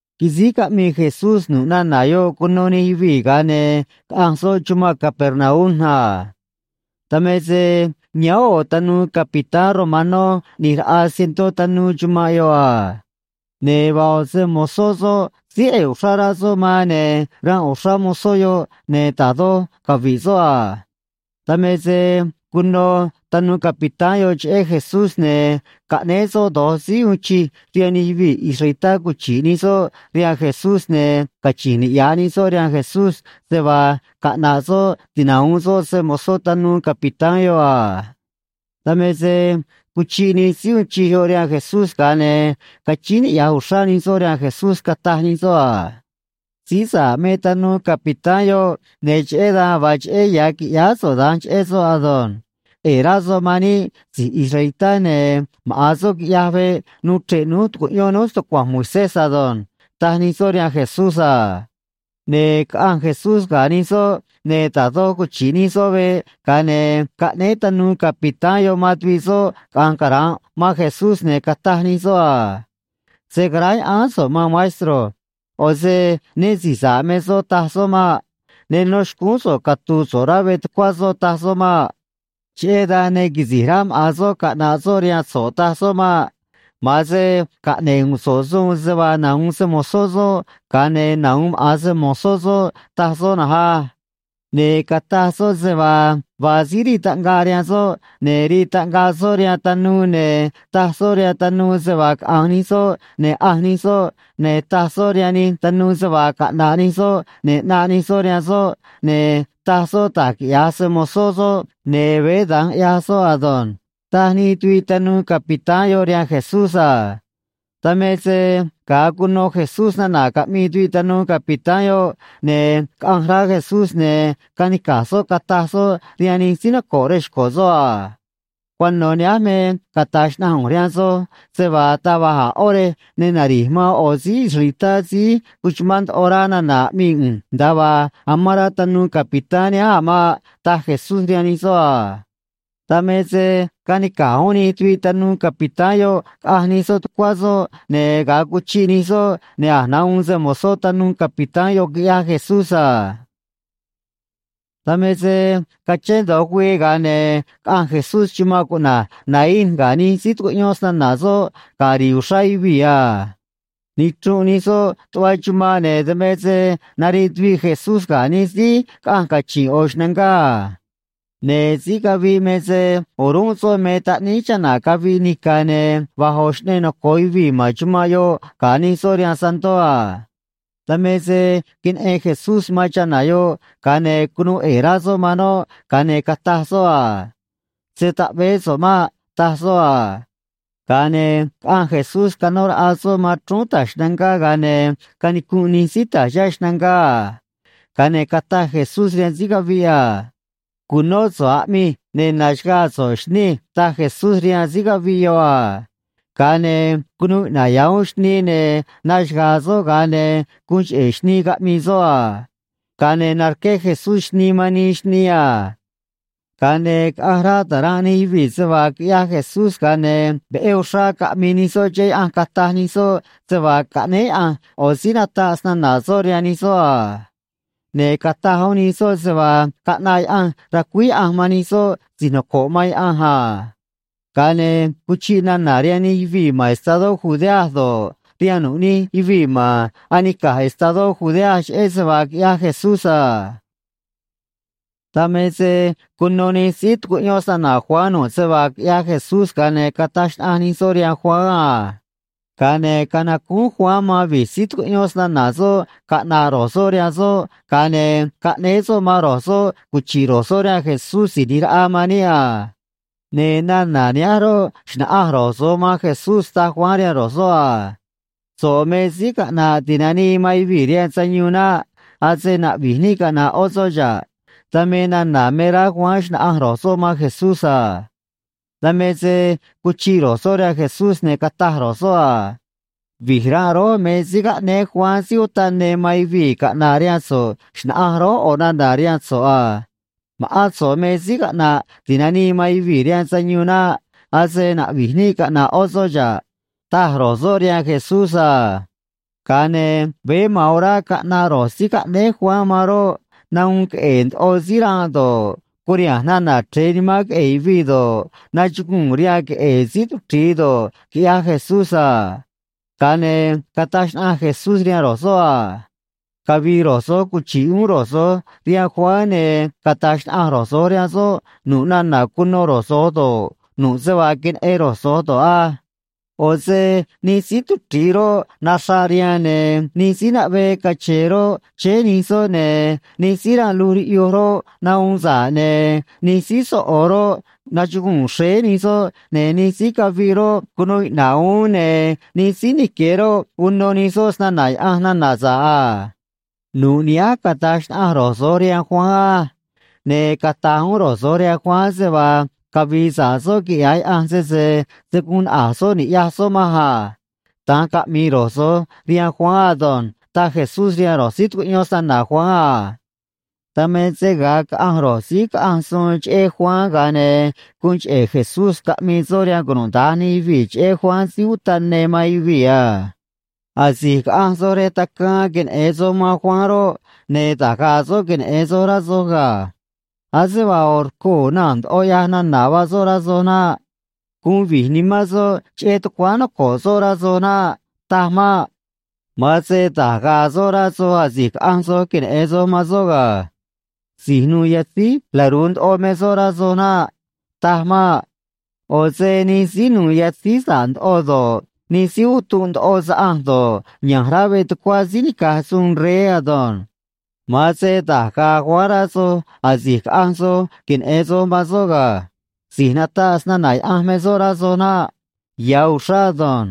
Quisíj caꞌmii Jesús nu̱ꞌ nana̱ yoꞌ cuno nij yuvii̱, ga̱a ne̱ caꞌanj soꞌ chumanꞌ Capernaum a. Dan me se yáán ꞌo̱ tanuu capitán romanó ꞌni̱j raꞌa cientó tanuu chumanꞌ yoꞌ a. Ne̱ vaa ꞌo̱ se‑mo̱zó soꞌ síí ꞌe̱e̱ uxrá rá soꞌ man, ne̱ ranꞌ uxrá mozó yoꞌ, ne̱ da̱j doj cavi̱ꞌ soꞌ a. Dan me se cuno tanuu capitán yoꞌ cheꞌé Jesús, ne̱ caꞌnéé soꞌ do̱j síí uun chij rihaan nij yuvii̱ israelitá cuchi̱ꞌ nij soꞌ rihaan Jesús, ne̱ cachi̱nj niꞌya̱j nij soꞌ rihaan Jesús se vaa caꞌna̱ꞌ soꞌ tinahu̱un soꞌ se‑mo̱zó tanuu capitán yoꞌ a. Dan me se cuchiꞌ nij síí uun chij yoꞌ rihaan Jesús, ga̱a ne̱ cachíín niꞌya̱j uxrá nij soꞌ rihaan Jesús, cataj nij soꞌ a: ―Síí sa̱ꞌ me tanuu capitán yoꞌ, ne̱ cheꞌé dan vaa cheꞌé ya̱ qui̱ꞌyáá so̱ꞌ da̱nj cheꞌé soꞌ ado̱nj. ꞌE̱e̱ rá soꞌ man níꞌ si̱j israelitá, ne̱ maꞌa̱n soꞌ quiꞌyaj veꞌ nuu chre̱ꞌ núj tu̱cuꞌyón núj stucua̱nj Moisés ado̱nj ―taj nij soꞌ rihaan Jesús a. Ne̱ caꞌanj Jesús ga̱ nij soꞌ, ne̱ da̱j doj cuchi̱ꞌ nij soꞌ veꞌ, ga̱a ne̱ caꞌnéé tanuu capitán yoꞌ man tuviꞌ soꞌ caꞌa̱nj cara̱nꞌ man Jesús, ne̱ cataj nij soꞌ a: ―Se̱ caráya̱ꞌáán so̱ꞌ, maan maestro. ꞌO̱ se né si̱j sa̱ꞌ me soꞌ, taj soꞌ maꞌ. Ne nó xcúún soꞌ catu̱u̱ so̱ꞌ rá veꞌ tucuá soꞌ, taj soꞌ maꞌ. Cheꞌé dan ne quisi̱j rá maꞌa̱n soꞌ caꞌna̱ꞌ soꞌ rihaan so̱ꞌ, taj soꞌ maꞌ. Ma̱an se caꞌne̱ꞌ u̱u̱n so̱ꞌ suun se vaa nahu̱un se‑mo̱zó soꞌ, ga̱a ne̱ nahu̱un maꞌa̱n se‑mo̱zó soꞌ, taj soꞌ na̱nj á. Ne̱ cataj soꞌ se vaa vaa síí rii taꞌngaꞌ rihaan soꞌ, ne̱ rii taꞌngaꞌ soꞌ rihaan tanuu, ne̱ taj soꞌ rihaan tanuu se vaa caꞌa̱nj nij soꞌ, ne̱ ꞌanj nij soꞌ, ne̱ taj soꞌ rihaan nij tanuu se vaa caꞌna̱ꞌ nij soꞌ, ne̱ ꞌnaꞌ nij soꞌ rihaan soꞌ, ne̱ taj soꞌ da̱j quiꞌya̱j se‑mo̱zó soꞌ, ne̱ veé da̱nj ꞌyaj soꞌ ado̱nj ―taj nij tuviꞌ tanuu capitán yoꞌ rihaan Jesús a. Dan me se ga̱a cuno Jesús nana̱ caꞌmii tuviꞌ tanuu capitán yoꞌ, ne̱ caꞌanj rá Jesús, ne̱ canica̱j soꞌ cataj soꞌ rihaan nij síí noco̱ꞌ rej xco̱ soꞌ a: ―Cuano̱ nihánj me cata̱j xnaꞌanj ꞌu̱nj rihaan soj se vaa taj va̱j a̱ ꞌó rej ne nari̱j man ꞌo̱ síí israelitá síí cuchumán ndoꞌo rá nana̱ aꞌmii ꞌu̱nj nda̱a vaa amán rá tanuu capitán nihánj a̱ maꞌ ―taj Jesús rihaan nij soꞌ a. Dan me se canica̱j uún nij tuviꞌ tanuu capitán yoꞌ caꞌanj nij soꞌ tucuá soꞌ, ne̱ ga̱a cuchiꞌ nij soꞌ, ne̱ a̱j nahuun se‑mo̱zó tanuu capitán yoꞌ, quiꞌyaj Jesús a. Dan me se cachén do̱j güii, ga̱a ne̱ caꞌanj Jesús chumanꞌ cuꞌna̱j Naín ga̱ nij síí tucuꞌyón snana̱ soꞌ ga̱ ri̱i̱ uxrá yuvii̱ a. Nichrunꞌ nij soꞌ tuꞌva chumanꞌ, ne̱ dan me se nariꞌ tuviꞌ Jesús ga̱ nij síí caꞌanj cachi̱nꞌ ꞌo̱ xnangá a. Ne̱ síí caviꞌ me se o̱rúnꞌ soꞌ me taꞌníí chana̱ caviꞌ nica̱, ne̱ va̱j ꞌo̱ xꞌneꞌ noco̱o yuvii̱ ma̱n chumanꞌ yoꞌ ga̱ nii soꞌ rihaan santó a. Dan me se queneꞌen Jesús man chana̱ yoꞌ, ga̱a ne̱ cunuu ꞌe̱e̱ rá soꞌ man noꞌ, ga̱a ne̱ cataj soꞌ a: ―Se̱ taꞌveé so̱ꞌ maꞌ ―taj soꞌ a. Ga̱a ne̱ caꞌanj Jesús canó raꞌa soꞌ man chrúún ta̱j xnangá, ga̱a ne̱ canicunꞌ nij síí ta̱j chihá xnangá a. Ga̱a ne̱ cataj Jesús rihaan síí caviꞌ a: ―Cu̱nó so̱ꞌ aꞌmij, ne̱ na̱xaga̱a̱ so̱ꞌ, xnij ―taj Jesús rihaan síí caviꞌ yoꞌ a. Ga̱a ne̱ cunuu iꞌna̱ꞌ ya̱ uún xnii, ne̱ naxaga̱a̱ soꞌ, ga̱a ne̱ guun cheꞌe̱ xnii caꞌmii soꞌ a. Ga̱a ne̱ narqué Jesús xnii man nii xnii a. Ga̱a ne̱ caꞌanj rá ta̱ranꞌ nij yuvii̱ se vaa quiꞌyaj Jesús, ga̱a ne̱ veꞌé uxrá caꞌmii nij soꞌ cheꞌé Yaꞌanj cataj nij soꞌ se vaa caꞌnéé Yaꞌanj ꞌo̱ síí nataꞌ snana̱ soꞌ rihaan nij soꞌ a. Ne̱ cataj uún nij soꞌ se vaa caꞌnaꞌ Yaꞌanj ra̱cuíj Yaꞌanj man nij soꞌ si̱j noco̱ꞌ man Yaꞌanj a. Ga̱a ne̱ cuchiꞌ nana̱ rihaan nij yuvii̱ ma̱n estadó Judea do̱ꞌ, rihaan nu̱ꞌ nij yuvii̱ ma̱n anica̱j estadó Judea cheꞌé se vaa quiꞌyaj Jesús a. Dan me se cuno nij síí tucuꞌyón snana̱ Juan nu̱ꞌ se vaa quiꞌyaj Jesús, ga̱a ne̱ cataj xnaꞌanj nij soꞌ rihaan Juan a. Ga̱a ne̱ canacúún Juan man vi̱j síí tucuꞌyón snana̱ soꞌ caꞌna̱ꞌ ro̱j soꞌ rihaan soꞌ, ga̱a ne̱ caꞌnéé soꞌ man ro̱j soꞌ cuchi̱ꞌ ro̱j soꞌ rihaan Jesús Si̱j ꞌNi̱j Raꞌa man níꞌ a. Ne̱ nana̱ nihánj roꞌ, xna̱ꞌanj ro̱j soꞌ man Jesús, taj Juan rihaan ro̱j soꞌ a: “So̱ꞌ me Síí Caꞌna̱ꞌ Ti̱nanii man Yuvii̱ rihaan Sayuun naꞌ. Ase na̱ꞌvi̱j níꞌ caꞌna̱ꞌ ꞌó soꞌ xa̱ꞌ.” Dan me nana̱ me rá Juan xna̱ꞌanj ro̱j soꞌ man Jesús a. Dan me se cuchiꞌ ro̱j soꞌ rihaan Jesús, ne̱ cataj ro̱j soꞌ a: ―Vi̱j ranꞌ rój me síí caꞌnéé Juan Síí Utaꞌ Ne man yuvii̱ caꞌna̱ꞌ rihaan so̱ꞌ xna̱ꞌanj rój ꞌo̱ nana̱ rihaan so̱ꞌ a. Ma̱ꞌán so̱ꞌ me Síí Caꞌna̱ꞌ Ti̱nanii man Yuvii̱ rihaan Sayuun naꞌ, ase na̱ꞌvi̱j níꞌ caꞌna̱ꞌ ꞌó soꞌ xa̱ꞌ ―taj ro̱j soꞌ rihaan Jesús a. Ga̱a ne̱ veé ma̱an orá caꞌnaꞌ ro̱j síí caꞌnéé Juan man roꞌ, nahuun queꞌe̱e̱ ndoꞌo síí ranꞌ do̱ꞌ, curiha̱nj nana̱ chre̱e nimán queꞌe̱e̱ yuvii̱ do̱ꞌ, nachuguu̱n rihaan queꞌe̱e̱ síí tuchri̱i do̱ꞌ, quiꞌyaj Jesús a. Ga̱a ne̱ cataj xnaꞌanj Jesús rihaan ro̱j soꞌ a: ―Cavi̱i̱ ro̱j so̱j cuchi̱ꞌ uún ro̱j so̱j rihaan Juan, ne̱ cata̱j xnaꞌanj ro̱j so̱j rihaan soꞌ nu̱ꞌ nana̱ cuno ro̱j so̱j do̱ꞌ, nu̱ꞌ se vaa queneꞌen ro̱j so̱j do̱ꞌ á. ꞌO̱ se nij síí tuchri̱i roꞌ, naxraꞌ rihaan, ne̱ nij síí naꞌvee cache̱e̱ roꞌ, chéé nij soꞌ, ne̱ nij síí ranꞌ luj riꞌyuj roꞌ, nahuun sa̱ꞌ, ne̱ nij síí soꞌo̱ roꞌ, nachuguu̱n xréé nij soꞌ, ne̱ nij síí caviꞌ roꞌ, cunuu iꞌna̱ꞌ uún, ne̱ nij síí nique̱ roꞌ, uno nij soꞌ snana̱ Yaꞌanj nana̱ sa̱ꞌ a. Nu̱ꞌ nihánj cata̱j xnaꞌanj ro̱j so̱j rihaan Juan á. Ne̱ cata̱j uún ro̱j so̱j rihaan Juan se vaa cavi̱i̱ sa̱ꞌ soꞌ quiꞌya̱j Yaꞌanj, sese se̱ guun naꞌa̱j soꞌ ni̱ꞌyaj soꞌ manj a. Da̱nj caꞌmi̱i̱ ro̱j so̱j rihaan Juan ado̱nj ―taj Jesús rihaan ro̱j síí tucuꞌyón snana̱ Juan a. Dan me se ga̱a caꞌanj ro̱j síí caꞌanj suun cheꞌé Juan, ga̱a ne̱ guun cheꞌe̱ Jesús caꞌmii soꞌ rihaan cunuda̱nj nij yuvii̱ cheꞌé Juan Síí Utaꞌ Ne man yuvii̱ a: ―Asi̱j caꞌanj soj rej tacaan queneꞌe̱n soj man Juan roꞌ, ne̱ da̱j ga̱a̱ soꞌ queneꞌe̱n soj, rá soj ga̱. Ase vaa ꞌo̱ rcoo̱ naa̱n ndoꞌo ꞌyaj nana̱ vaa soꞌ, rá soj naꞌ. Guun vi̱j nimán soꞌ cheꞌé tucuáán noco̱ꞌ soꞌ, rá soj naꞌ. Taj maꞌ. Ma̱an se da̱j ga̱a̱ soꞌ rá soj, asi̱j caꞌanj soj queneꞌe̱n soj man soꞌ ga̱. Si̱j nu̱u̱ yatzíj laru̱u ndoꞌo me soꞌ, rá soj naꞌ. Taj maꞌ. ꞌO̱ se nij síí nu̱u̱ yatzíj sa̱ꞌ ndoꞌo do̱ꞌ, nij síí utunꞌ ndoꞌo saꞌanj do̱ꞌ, ya̱nj rá veꞌ tucuá síí nica̱j suun rey ado̱nj. Ma̱an se da̱j ga̱a̱ Juan rá soj, asi̱j caꞌanj soj queneꞌe̱n soj man soꞌ ga̱. Si̱j nataꞌ snana̱ Yaꞌanj me soꞌ, rá soj naꞌ. Ya̱ uxrá ado̱nj.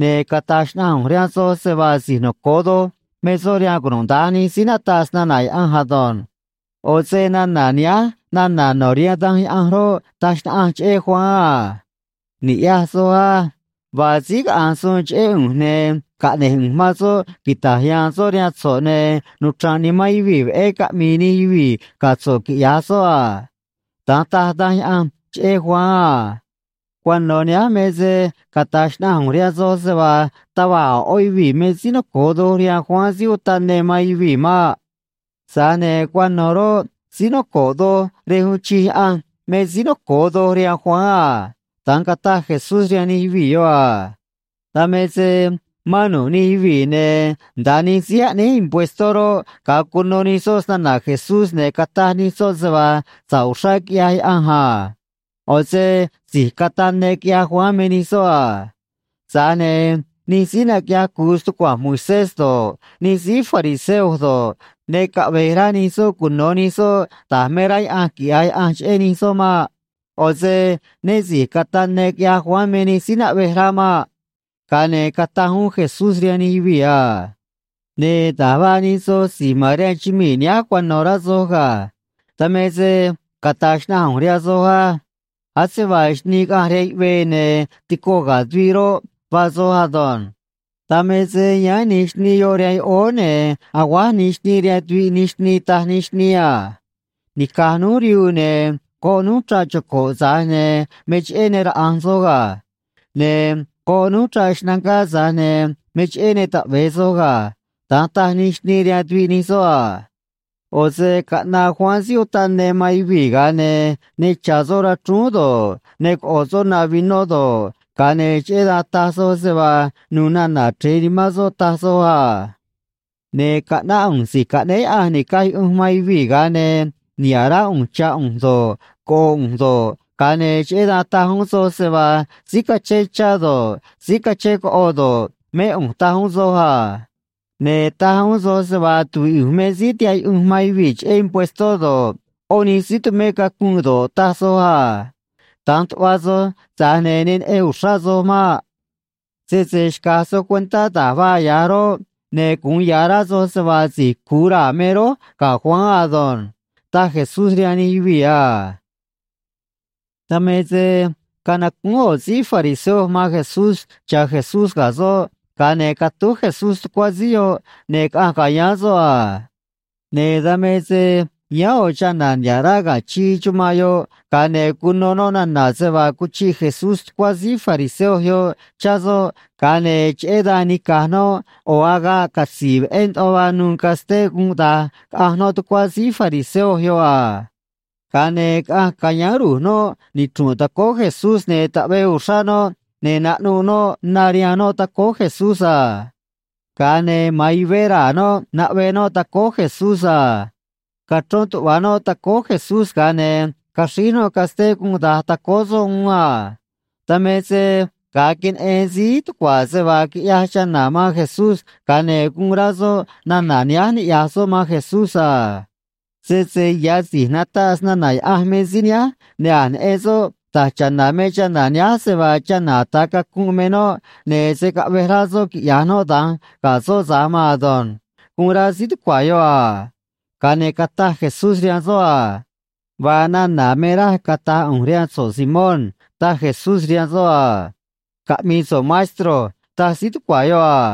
Ne̱ cata̱j xnaꞌanj ꞌu̱nj rihaan soj se vaa si̱j noco̱o doj me soꞌ rihaan cunuda̱nj nij síí nataꞌ snana̱ Yaꞌanj ado̱nj. ꞌO̱ se nana̱ nihánj nana̱ no̱ rihaan Danj Yaꞌanj roꞌ, taj xnaꞌanj cheꞌé Juan a: Ni̱ꞌyaj soj á. Vaa síí caꞌanj suun cheꞌé ꞌu̱nj, ne̱ caꞌne̱j ꞌu̱nj man soꞌ quita̱j ya̱a̱n soꞌ rihaan so̱ꞌ, ne̱ nuchra̱nꞌ nimán yuvii̱ veꞌé caꞌmi̱i̱ nij yuvii̱ ga̱ so̱ꞌ, quiꞌya̱j soꞌ a. Da̱nj taj Danj Yaꞌanj cheꞌé Juan a. Cuano̱ nihánj me se cata̱j xnaꞌanj ꞌu̱nj rihaan soj se vaa taj va̱j a̱ ꞌó yuvii̱ me síí noco̱o doj rihaan Juan Síí Utaꞌ Ne man yuvii̱ maꞌ. Tza̱j ne̱ cuano̱ roꞌ, síí noco̱ꞌ doj rej uun chij Yaꞌanj me síí noco̱o doj rihaan Juan a ―da̱nj cataj Jesús rihaan nij yuvii̱ yoꞌ a. Dan me se mán nu̱ꞌ nij yuvii̱, ne̱ nda̱a nij síí aꞌnéj impuestó roꞌ, ga̱a cuno nij soꞌ snana̱ Jesús, ne̱ cataj nij soꞌ se vaa sa̱ꞌ uxrá quiꞌyaj Yaꞌanj a. ꞌO̱ se si̱j cataꞌ ne quiꞌyaj Juan me nij soꞌ a. Tza̱j ne̱ nij síí naquiꞌyaj cu̱u stucua̱nj Moisés do̱ꞌ, nij síí fariseo do̱ꞌ, ne caꞌve̱j rá nij soꞌ cuno̱ nij soꞌ da̱j me rá Yaꞌanj quiꞌya̱j Yaꞌanj cheꞌé nij soꞌ maꞌ. ꞌO̱ se né si̱j cataꞌ ne quiꞌyaj Juan me nij síí naꞌvej rá maꞌ. Ga̱a ne̱ cataj uún Jesús rihaan nij yuvii̱ a: ―Ne̱ da̱j vaa nij soj si̱j ma̱n rihaan chumii̱ nihánj cuano̱, rá soj ga̱. Dan me se cata̱j xnaꞌanj ꞌu̱nj rihaan soj á. Ase vaa xnii caꞌanj rihaan yuꞌvee ne̱ tico ga̱ tuviꞌ roꞌ, vaa soj ado̱nj. Dan me se yáán nij xnii yoꞌ rihaan yoꞌóó, ne̱ aguáj nij xnii rihaan tuviꞌ nij xnii, taj nij xnii a: “Nica̱j núj rihuu, ne̱ goꞌ núj chraꞌ choco̱ꞌ, tza̱j ne̱ me cheꞌé ne raꞌa̱nj soj ga̱. Ne̱ goꞌ núj chraꞌ xnangá, tza̱j ne̱ me cheꞌé ne taꞌve̱e soj ga̱.” Da̱nj taj nij xnii rihaan tuviꞌ nij soꞌ a. ꞌO̱ se caꞌnaꞌ Juan Síí Utaꞌ Ne man yuvii̱, ga̱a ne̱ ne cha̱ soꞌ rachrúún do̱ꞌ, ne coꞌo̱ soꞌ na vinó do̱ꞌ, ga̱a ne̱ cheꞌé dan taj soj se vaa nu̱u̱ nana̱ chre̱e nimán soꞌ, taj soj a. Ne̱ caꞌnáꞌ ꞌu̱nj Si̱j Caꞌnéé Yaꞌanj Ni̱caj Yuꞌunj man Yuvii̱, ga̱a ne̱ niha̱ꞌ rá ꞌu̱nj chá ꞌu̱nj do̱ꞌ, coꞌo ꞌu̱nj do̱ꞌ, ga̱a ne̱ cheꞌé dan taj uún soj se vaa síí cachén chá do̱ꞌ, síí cachén coꞌo do̱ꞌ, mé ꞌu̱nj, taj uún soj a. Ne̱ taj uún soj se vaa tuvíꞌ ꞌu̱nj me síí tihaꞌ yuꞌunj man yuvii̱ cheꞌé impuestó do̱ꞌ, ꞌó nij síí tumé cacunꞌ do̱ꞌ, taj soj a. Da̱nj tuꞌva soj, tza̱j ne̱ ne neꞌen uxrá soj maꞌ. Sese xca̱j soj cuentá da̱j vaa ꞌyaj rój, ne̱ gu̱un ya̱ rá soj se vaa si̱j cu̱u raa̱ me rój ga̱ Juan ado̱nj ―taj Jesús rihaan nij yuvii̱ a. Dan me se canacúún ꞌo̱ síí fariseo man Jesús cha̱ Jesús ga̱ soꞌ, ga̱a ne̱ catúj Jesús tucuá síí yoꞌ ne̱ caꞌanj ca̱yáán soꞌ a. Ne̱ dan me se yáán ꞌo̱ chana̱ niha̱ꞌ rá ga̱ chii chumanꞌ yoꞌ, ga̱a ne̱ cuno noꞌ nana̱ se vaa cuchiꞌ Jesús tucuá síí fariseo yoꞌ chá soꞌ, ga̱a ne̱ cheꞌé dan nica̱j noꞌ ꞌo̱ agaꞌ catzi̱i̱ veꞌé ndoꞌo vaa nu̱u̱ casté gunꞌ da̱j, caꞌanj noꞌ tucuá síí fariseo yoꞌ a. Ga̱a ne̱ caꞌanj ca̱yáán ru̱j noꞌ nichru̱nꞌ tacóó Jesús, ne̱ taꞌvee uxrá noꞌ, ne̱ naꞌnuꞌ noꞌ na rihaan noꞌ tacóó Jesús a. Ga̱a ne̱ ma̱an yuvé raa̱ noꞌ naꞌve noꞌ tacóó Jesús a. Cachrón tuꞌva̱ noꞌ tacóó Jesús, ga̱a ne̱ caxríj noꞌ casté gunꞌ da̱j tacóó soꞌ uún a. Dan me se ga̱a queneꞌen síí tucua̱ se vaa quiꞌyaj chana̱ man Jesús, ga̱a ne̱ guun rá soꞌ nana̱ nihánj niꞌya̱j soꞌ man Jesús a: “Sese ya̱ si̱j nataꞌ snana̱ Yaꞌanj me síí nihánj, ne̱ a̱j neꞌen soꞌ da̱j cha̱na̱ me chana̱ nihánj, se vaa chana̱ ata̱ cacunꞌ me noꞌ, ne̱ se̱ caꞌvej rá soꞌ quiꞌya̱j noꞌ da̱nj ga̱ soꞌ tza̱j maan ado̱nj”, guun rá síí tucua̱ yoꞌ a. Ga̱a ne̱ cataj Jesús rihaan soꞌ a: ―Vaa nana̱ me raj cata̱j ꞌu̱nj rihaan so̱ꞌ, Simón ―taj Jesús rihaan soꞌ a. ―Caꞌmi̱i̱ so̱ꞌ, maestro ―taj síí tucua̱ yoꞌ a.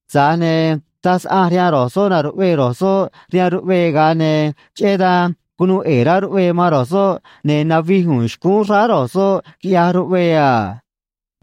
Tza̱j ne̱ taj saꞌanj rihaan ro̱j soꞌ na̱ruꞌvee ro̱j soꞌ rihaan ruꞌvee, ga̱a ne̱ cheꞌé dan cunuu ꞌe̱e̱ rá ruꞌvee man ro̱j soꞌ, ne̱ navij u̱u̱n xcúún xráá ro̱j soꞌ, quiꞌyaj ruꞌvee a.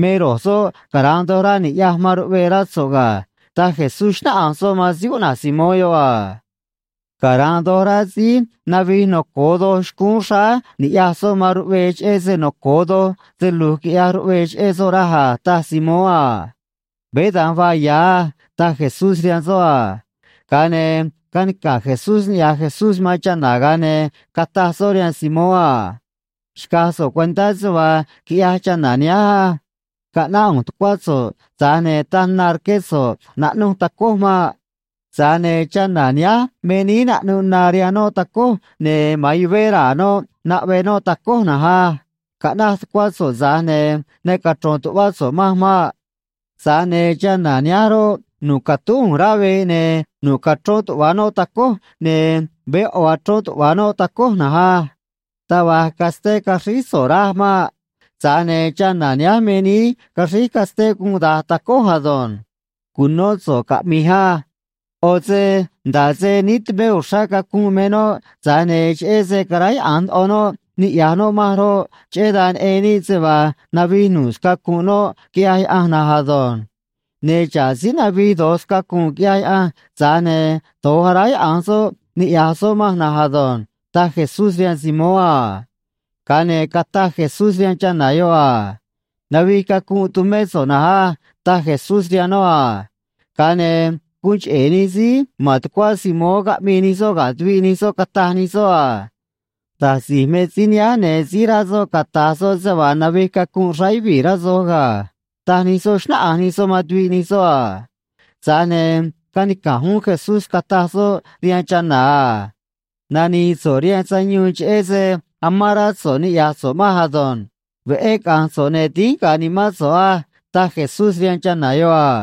Me ro̱j soꞌ cara̱nꞌ doj rá ni̱ꞌyaj man ruꞌvee, rá so̱ꞌ ga̱ ―taj Jesús, xnáꞌanj soꞌ man síí cuꞌna̱j Simón yoꞌ a. ―Cara̱nꞌ doj rá síí navij noco̱o doj xcúún xráá ni̱ꞌyaj soꞌ man ruꞌvee, cheꞌé se noco̱o doj se lu̱j quiꞌyaj ruꞌvee cheꞌé soꞌ, raj a ―taj Simón a. ―Veé da̱nj vaa ya̱ á ―taj Jesús rihaan soꞌ a. Ga̱a ne̱ canica̱j Jesús niꞌya̱j Jesús man chana̱, ga̱a ne̱ cataj soꞌ rihaan Simón a: ―Xca̱j so̱ꞌ cuentá se vaa quiꞌyaj chana̱ nihánj á. Caꞌnáꞌ ꞌu̱nj tucuá so̱ꞌ, tza̱j ne̱ taj na rqué so̱ꞌ naꞌnu̱j tacój maꞌ. Tza̱j ne̱ chana̱ nihánj me níí naꞌnuꞌ na rihaan noꞌ tacój, ne̱ ma̱an yuvé raa̱ noꞌ naꞌve noꞌ tacój na̱nj á. Caꞌnaj tucuá so̱ꞌ, tza̱j ne̱ ne cachro̱n tu̱ꞌvá so̱ꞌ manj maꞌ. Tza̱j ne̱ chana̱ nihánj roꞌ, nu̱ꞌ catúj ꞌu̱nj rá veꞌ, ne̱ nu̱ꞌ cachrón tuꞌva̱ noꞌ tacój, ne̱ veé ꞌo̱ achrón tuꞌva̱ noꞌ tacój na̱nj á. Taj va̱j casté caxríj so̱ꞌ raj maꞌ. Tza̱j ne̱ chana̱ nihánj me níí caxríj casté gunꞌ da̱j tacój ado̱nj. Cu̱nó so̱ꞌ caꞌmi̱j á. ꞌO̱ se nda̱ꞌ se níí tumé uxrá cacunꞌ me noꞌ, tza̱j ne̱ cheꞌé se caráyaꞌa̱nj ndoꞌo noꞌ niꞌya̱j noꞌ manj roꞌ, cheꞌé dan neꞌen níꞌ se vaa navij nu̱ꞌ scacu̱nꞌ noꞌ quiꞌyaj Yaꞌanj na̱nj ado̱nj. Ne̱ xa̱ꞌ síí navij do̱j scacu̱nꞌ quiꞌyaj Yaꞌanj, tza̱j ne̱ do̱j aráyaꞌa̱nj soꞌ niꞌya̱j soꞌ manj na̱nj ado̱nj ―taj Jesús rihaan Simón a. Ga̱a ne̱ cataj Jesús rihaan chana̱ yoꞌ a: ―Navij cacunꞌ tumé so̱ꞌ na̱nj á ―taj Jesús rihaan noꞌ a. Ga̱a ne̱ guun cheꞌe̱ nij síí ma̱n tucuá Simón caꞌmii nij soꞌ ga̱ tuviꞌ nij soꞌ, cataj nij soꞌ a: ―Da̱j si̱j me síí nihánj, ne̱ síj rá soꞌ cata̱j soꞌ se vaa navij cacunꞌ xráá yuvii̱, rá soj ga̱ ―taj nij soꞌ, xnáꞌanj nij soꞌ man tuviꞌ nij soꞌ a. Tza̱j ne̱ canica̱j uún Jesús, cataj soꞌ rihaan chana̱ a: ―Nani̱i̱ so̱ꞌ rihaan sayuun, cheꞌé se amán rá so̱ꞌ niꞌya̱j so̱ꞌ manj ado̱nj. Veꞌé caꞌa̱nj so̱ꞌ, ne̱ dínj ga̱a̱ nimán so̱ꞌ á ―taj Jesús rihaan chana̱ yoꞌ a.